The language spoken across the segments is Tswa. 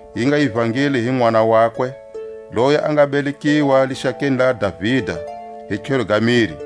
yi nga ivangeli hi Nʼwana wakwe, loyi a nga belekiwa lixakeni la Davida hi tlhelo ga miri.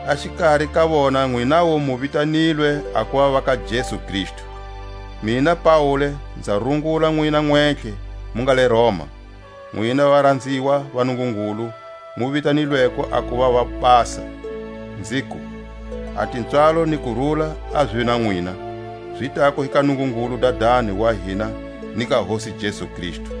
A xikari ka vona nwinawu mu vitanilwe a kuva va ka Jesu Kristu. Mina Paule nza rungula nwina nwentlhe mu nga le Roma, nwina varanziwa va Nungungulu mu vitanilweko a kuva vobasa, nziku: A tipswalo ni kurula a zive na nwina, zi tako hi ka Nungungulu Dadani wa hina ni ka Hosi Jesu Kristu.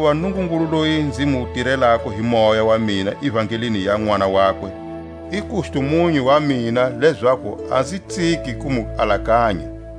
Hakuva Nungungulu loyi nzi mu tirelako hi moya wa mina ivangelini ya Nʼwana wakwe, i kustumunyu wa mina lezaku a nzi tsiki ku mu alakanya.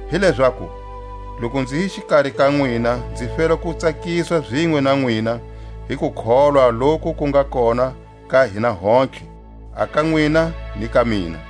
Hi lezaku, loku nzi hi xikari ka nwina nzi fela ku tsakiswa zinwe na nwina hi kukholwa loku ku nga kona ka hina hontlhe, a ka nwina ni ka mina.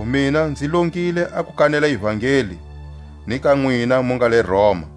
Hikwalaho mina nzi longile a ku kanela ivangeli ni ka nwina mu nga le Roma.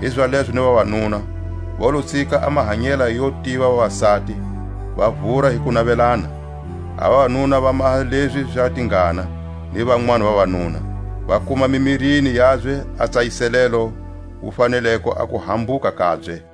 Hizalezo ni vavanuna, va lo tsika a mahanyela yo tiva vavasati, va vura hi ku navelana, a vavanuna va maha lezi za tingana ni vanwani vavanuna, va kuma mimirini yabye a tsayiselelo wu faneleko a kuhambuka kabye.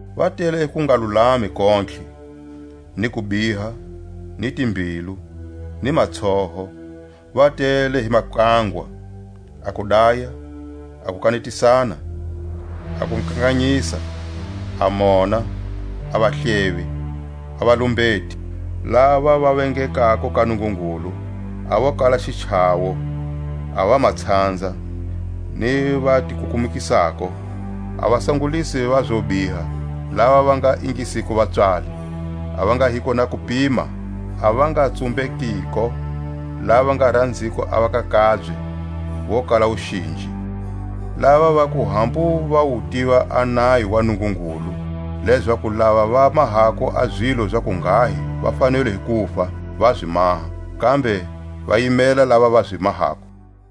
Va tele hi kungalulami kontlhe, ni kubiha, ni timbilu, ni matsoho; va tele hi makangwa, a kudaya, a kukanetisana, a kukanganyisa, a mona; a vahlevi, a valumbeti, lava va vengekako ka Nungungulu, a vo kala xichawo, a vamatshanza, ni vatikukumukisako, a vasangulisi va zobiha, lava va nga ingisiko vapswali, a va nga hiko na kupima, a va nga tsumbekiko, lava va nga ranziko a va ka kabye, vo kala wuxinji; lava vaku hambu va wu tiva a nayo wa Nungungulu, lezaku lava va mahako a zilo za kunghahi va fanelwe hi kufa, va zi maha, kambe va yimela lava va zi mahako.